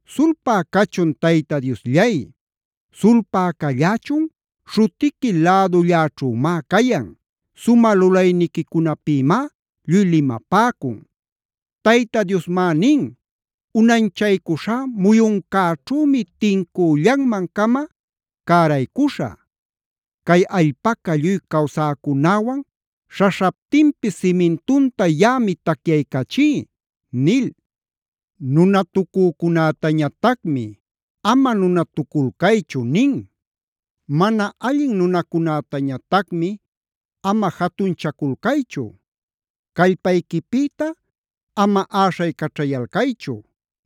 Sulpä cachun Tayta Diosllay, sulpä callächun, śhutiqui lädulläćhümá cayan, sumä lulayniquicunapïmá lluy limapäcun. Tayta Diosmá nin: “Unanchaycuśhá muyuncäćhümi tincüllanman-cama cäraycuśhä. Cay allpaca lluy cawsäcunäwan śhaśhaptinpis simintunta yaꞌami tacyaycachí” nil. Nunatucücunätañatacmi: “Ama nunatuculcaychu” nin. Mana allin nunacunätañatacmi: “Ama jatunchaculcaychu. Callpayquipïta ama äśhaycaćhayalcaychu;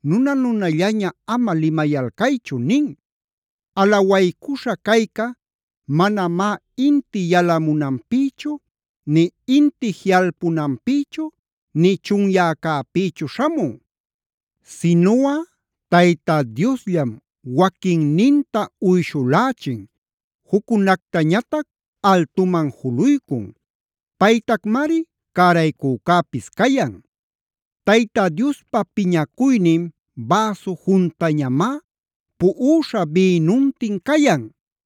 nuna-nunallaña ama limayalcaychu” nin. Alawaycuśha cayca manamá inti yalamunanpïchu nï inti jiꞌalpunanpïchu nï chunyäcäpïchu śhamun. Sinuꞌa Tayta Diosllam, waquinninta uyshulächin, juccunactañatac altuman juluycun. Paytacmari cäraycücäpis cayan. Tayta Diospa piñacuynin bäsu juntañamá, puꞌuśha bïnuntin cayan.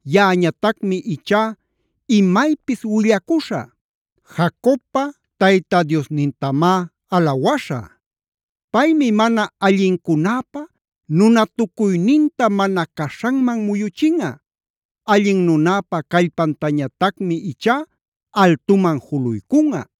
Yaꞌañatacmi ichá imaypis willacuśhä. Jacobpa Tayta Diosnintamá alawaśhä. Paymi mana allincunäpa nunatucuyninta mana caśhanman muyuchinꞌa. Allin nunäpa callpantañatacmi ichá altuman juluycunꞌa.